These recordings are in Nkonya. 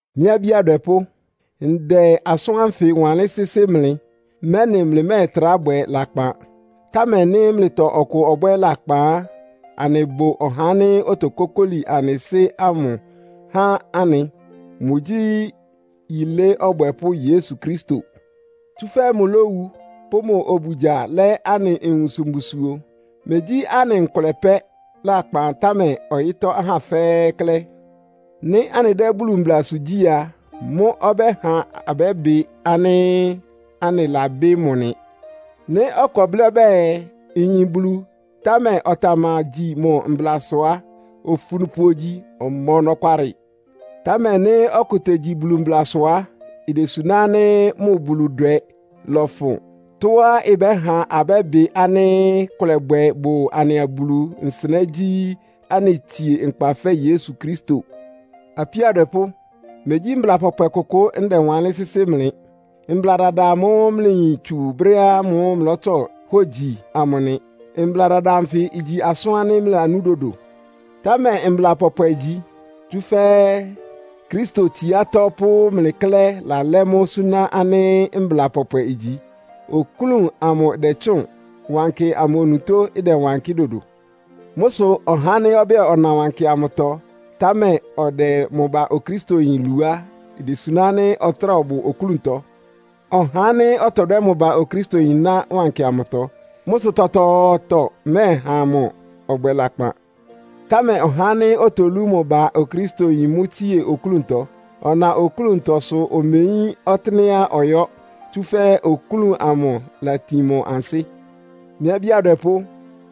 Mɩ́ abí adwɛpʋ́, ndɛ asʋ́n ánfɩ wanlɩ́n sɩ́sɩ́ mlɩ, mɛ́nɩ mlɩmɛ́ɛtrá bwɛ lakpan. Támɛ nɩ́ mlɩtɔ ɔkʋ ɔbwɛ́ lakpan á, anɩbʋ ɔhá ánɩ́ otokókóli anɩ Sɩ́ ámʋ há anɩ. Mʋgyí yilé ɔbwɛpʋ́ Yesu Kristo. Tsúfɛ́ mʋlówu, pʋ́ mʋ obugya lɛ́ anɩ nwunsʋ mbusuo. Megyí anɩ nkʋlɛ pɛ́ lakpan, támɛ ɔyɩ́tɔ́ ahá fɛ́ɛ́ klɛ́. Nɩ́ anɩdɛ́ Bulu mblasʋ gyí a, mʋ́ ɔbɛ́ha abɛ́bɩ ánɩ́ anɩlabɩ́ mʋ nɩ. Nɩ́ ɔkʋ ɔblɩ́ ɔbɛ́ɛ, “Nyin Bulu,” támɛ ɔtamagyi mʋ mblasʋ á, ofunupʋ ogyi. Ɔma ɔnɔkwalɩ. Támɛ nɩ́ ɔkʋ tegyi Bulu mblasʋ á, idesuná ánɩ́ mʋ Buludwɛ lɔfʋn. Tɔ́á ɩbɛ́ha abɛ́bɩ ánɩ́ kʋlɛbwɛ bʋ anɩa Bulu nsɩnɛ́ gyí, anɩtsie nkpa fɛ́ Yesu Kristo. Apíó adwɛpʋ́, megyí mbla pɔpwɛ kʋkʋ ndɛwanlɩ́n sɩ́sɩ́ mlɩ. Mbla dada amʋ́ʋ́ mlɩyin tsú brɛ́ ámʋ́ʋ́ mlɩlɔ́tsɔ hógyi amʋ nɩ. Mbla dada anfɩ igyi asʋ́n ánɩ́ mlɩlanú dodo. Támɛ mbla pɔpwɛ igyi. Tsúfɛ́ Kristo tsiátɔ́ pʋ́ mlɩ klɛ́ lalɛ́ mʋ́ súná ánɩ́ mbla pɔpwɛ igyi. Oklún amʋ ɩdɛtsʋ́ʋn. Wankɩ amʋ onutó ɩdɛwankɩ́ dodo. Mʋ́ sʋ ɔhá ánɩ́ ɔbɛ́ɛ, ɔna wankɩ amʋtɔ, támɛ ɔdɛ mʋ ba Okristoyin lu á, idesuná ánɩ́ ɔtráa ɔbʋ oklúntɔ. Ɔhá ánɩ́ ɔtɔdwɛ́ mʋ ba Okristoyin ná wankɩ amʋtɔ. Mʋ́ sʋ tɔtɔɔtɔ mɛ́ɛha mʋ ɔbwɛ lakpan. Támɛ ɔhá ánɩ́ otolú mʋ ba Okristoyin mʋ́ tsie oklúntɔ. Ɔna oklúntɔ, sʋ omeyín ɔtɩ́nɛ́á ɔyɔ́, tsúfɛ́ oklún amʋ ɩlatin mʋ ansɩ́. Mɩ́ abí adwɛpʋ́,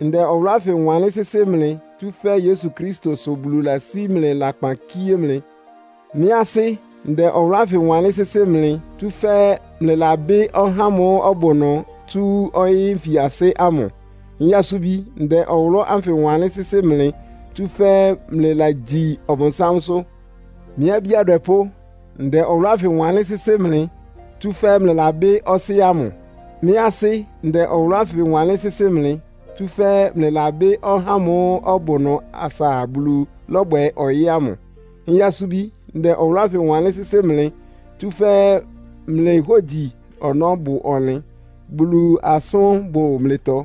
ndɛ ɔwʋlʋ́ ánfɩ wanlɩ́n sɩ́sɩ́ mlɩ, tsúfɛ́ Yesu Kristo sʋ Bulu lasí mlɩ lakpan kíé mlɩ. Mɩ́ asɩ́, ndɛ ɔwʋlʋ́ ánfɩ wanlɩ́n sɩ́sɩ́ mlɩ, tsúfɛ́ mlɩlabɩ́ ɔhá ámʋ́ʋ́ ɔbʋ ɩnʋ tsú ɔyɩ́ nfiasɩ́ ámʋ. Nyasubi, ndɛ ɔwʋlʋ́ ánfɩ wanlɩ́n sɩ́sɩ́ mlɩ, tsúfɛ́ mlɩlagyi Ɔbʋnsámsʋ́. Mɩ́ abí adwɛpʋ́, ndɛ ɔwʋlʋ́ ánfɩ wanlɩ́n sɩ́sɩ́ mlɩ, tsúfɛ́ mlɩlabɩ́ Ɔsɩ́ ámʋ. Mɩ́ asɩ́, ndɛ ɔwʋlʋ́ ánfɩ wanlɩ́n sɩ́sɩ́ mlɩ, tsúfɛ́ mlɩlabɩ́ ɔhá ámʋ́ʋ́ ɔbʋ ɩnʋ asa Bulu lɔ́bwɛ ɔyɩ́ ámʋ. Nyasubi, ndɛ ɔwʋlʋ́ ánfɩ wanlɩ́n sɩ́sɩ́ mlɩ, tsúfɛ́ mlɩ hógyi ɔnɔ́ bʋ ɔnlɩn, Bulu asʋ́n bʋ mlɩtɔ.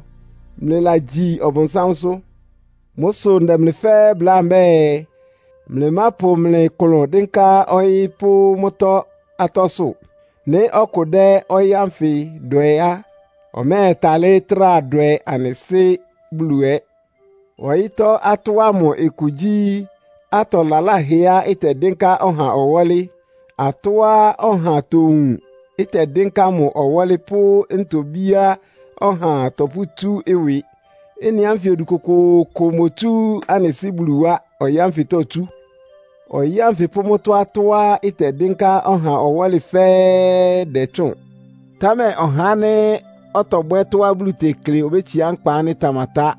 Mlɩlagyi Ɔbʋnsámsʋ́. Mʋ́ sʋ ndɛ mlɩ fɛ́ɛ́ bláa mbɛ́ɛ, mlɩmápʋ mlɩ klʋn dɩ́nká ɔyɩ́ pʋ́ mʋ́tɔ́ atɔ́sʋ́. Nɩ́ ɔkʋ dɛ́ ɔyɩ́ ánfɩ dwɛ á, ɔmɛ́ɛtalɩ́ trá dwɛ anɩ Sɩ́ Bulu ɛ. Ɔyɩ́tɔ́ atɔ́ ámʋ ɩkʋ gyí, atɔ laláhɛá ɩtɛdɩ́nká ɔha ɔwɔ́lɩ; atɔ́á ɔha towun, ɩtɛdɩ́nká mʋ ɔwɔ́lɩ pʋ́ ntobíá ɔha tɔpʋ́tsú ɩwɩ. Ɩ́nɩ ánfɩ odu kʋkʋʋkʋ imotsú anɩ Sɩ́ Bulu wá, ɔyɩ́ ánfɩtɔ itsú. Ɔyɩ́ ánfɩ pʋ́ mʋ́tɔ́ atɔ́á ɩtɛdɩ́nká ɔha ɔwɔ́lɩ fɛ́ɛ́ dɛtsʋ́ʋn. Támɛ ɔhá ánɩ́ ɔtɔbwɛ́ tɔ́á Bulu tekle obétsiá nkpa ánɩ́ ɩtamatá.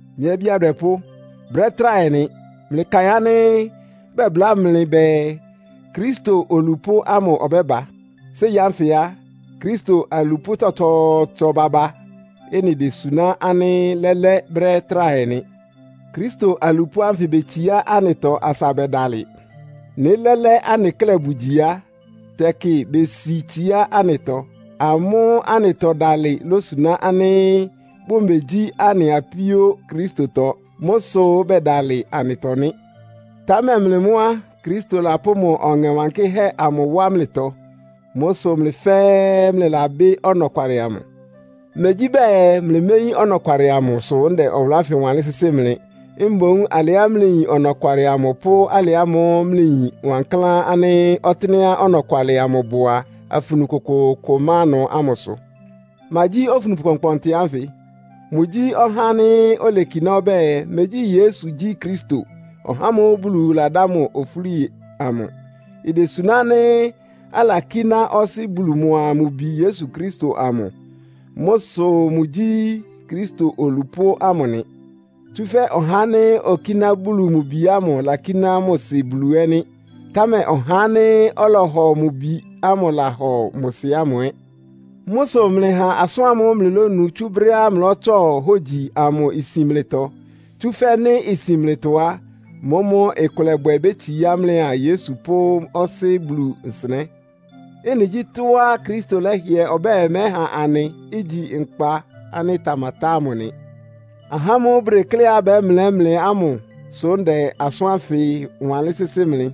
Mɩ́ abí adwɛpʋ́, brɛ́ tráhɛ nɩ. Mlɩkaɩn ánɩ́ bɛbláa mlɩ bɛɛ, Kristo olupʋ́ ámʋ ɔbɛ́ba. Séi ánfɩ á, Kristo alupʋ́ tsɔtsɔɔtsɔ baba. Ɩ́nɩ désuná ánɩ́ lɛ́lɛ́ brɛ́ tráhɛ nɩ. Kristo alupʋ́ ánfɩ betsiá anɩtɔ asa bɛdalɩ. Nɩ́ lɛ́lɛ́ anɩ klɛ́ bʋgyi á, tɛkɩ besi tsiá anɩtɔ. Amʋ́ anɩtɔdalɩ lósuná ánɩ́ bʋmegyí anɩ apíó Kristotɔ. Mʋ́ sʋ bɛdalɩ anɩtɔ nɩ́. Támɛ mlɩ mʋ́ á, Kristo lapʋ́ mʋ Ɔŋɛ Wankɩ́hɛ́ amʋ wá mlɩtɔ. Mʋ́ sʋ mlɩ fɛ́ɛ́ mlɩlabɩ́ ɔnɔkwalɩ amʋ. Megyí bɛɛ mlɩméyín ɔnɔkwalɩ amʋ, sʋ́ ndɛ asʋ́n ánfɩ wanlɩ́n sɩ́sɩ́ mlɩ. Mboún alɩá mlɩyin ɔnɔkwalɩ amʋ, pʋ́ alɩ ámʋ́ʋ́ mlɩyin wankláán ánɩ́ ɔtɩ́nɛ́á ɔnɔkwalɩ amʋ bʋ a, afunu kʋkʋʋkʋ ɩma ɩnʋ ámʋ sʋ. Ma gyí ofunupʋ kpɔnkpɔntɩ ánfɩ? Mʋgyí ɔhá ánɩ́ olekiná ɔbɛ́ɛ, “Megyí Yesu gyí Kristo, (ɔhá ámʋ́ʋ́ Bulu ladá mʋ ofúli amʋ).” Idesuná ánɩ́ alakíná Ɔsɩ́ Bulu mʋa mʋ Bi Yesu Kristo amʋ. Mʋ́ sʋ mʋgyí Kristo olupʋ́ ámʋ nɩ. Tsúfɛ́ ɔhá ánɩ́ okíná Bulu mʋ Bi ámʋ lakíná mʋ Sɩ Bulu ɛ́ nɩ́. Támɛ ɔhá ánɩ́ ɔlɔhɔ mʋ Bi ámʋ lahɔ mʋ Sɩ ámʋ ɛ́. Mʋ́ sʋ mlɩha asʋ́n ámʋ́ʋ́ mlɩlónu tsú brɛ́ ámʋ́ʋ́ mlɩlɔ́tsɔ hógyi amʋ isin mlɩtɔ. Tsúfɛ́ nɩ́ isin mlɩtɔ á, mʋ́mʋ́ ɩkʋlɛbwɛ bétsiá mlɩa Yesu pʋ́ Ɔsɩ́ Bulu nsɩnɛ́. Ɩ́nɩ gyí tɔ́á Kristo lɛ́hɩɛ ɔbɛ́ɛ mɛ́ha anɩ, igyi nkpa ánɩ́ ɩtamatá ámʋ nɩ. Ahá ámʋ́ʋ́ bʋdekléá bɛ́mlɛ́ mlɩ ámʋ sʋ́ ndɛ asʋ́n ánfɩ wanlɩ́n sɩ́sɩ́ mlɩ.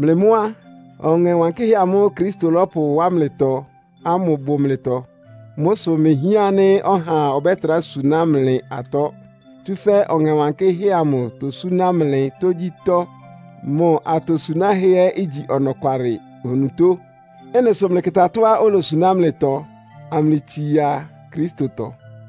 Mlɩ mʋ́ á, Ɔŋɛ Wankɩ́hɛ́ amʋ́ʋ́ Kristo lɔ́pʋwá mlɩtɔ ámʋ bʋ mlɩtɔ. Mʋ́ sʋ imehián ánɩ́ ɔhaa ɔbɛ́trá suná mlɩ atɔ́. Tsúfɛ́ Ɔŋɛ Wankɩ́hɛ́ amʋ tosúná mlɩ tógyítɔ́. Mʋ atosunáhɛ́ ɛ́ igyi ɔnɔkwalɩ onutó. Ɩ́nɩ sʋ mlɩkɩta tɔ́á olosuná mlɩtɔ, amlɩtsia Kristotɔ.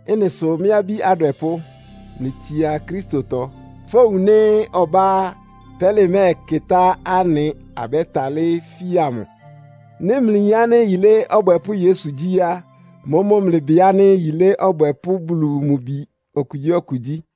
Ɩ́nɩ sʋ mɩ́ abí adwɛpʋ́, mlɩtsia Kristotɔ. Fówun nɩ́ ɔbá á, pɛ́lɩ mɛ́ɛkɩtá anɩ, abɛ́talɩ́ fia mʋ. Nɩ́ mlɩyin ánɩ́ yilé ɔbwɛpʋ́ Yesu gyí á, mʋ́mʋ́ mlɩbɩ ánɩ́ yilé ɔbwɛpʋ́ Bulu mʋ bi okugyíɔkʋ gyí.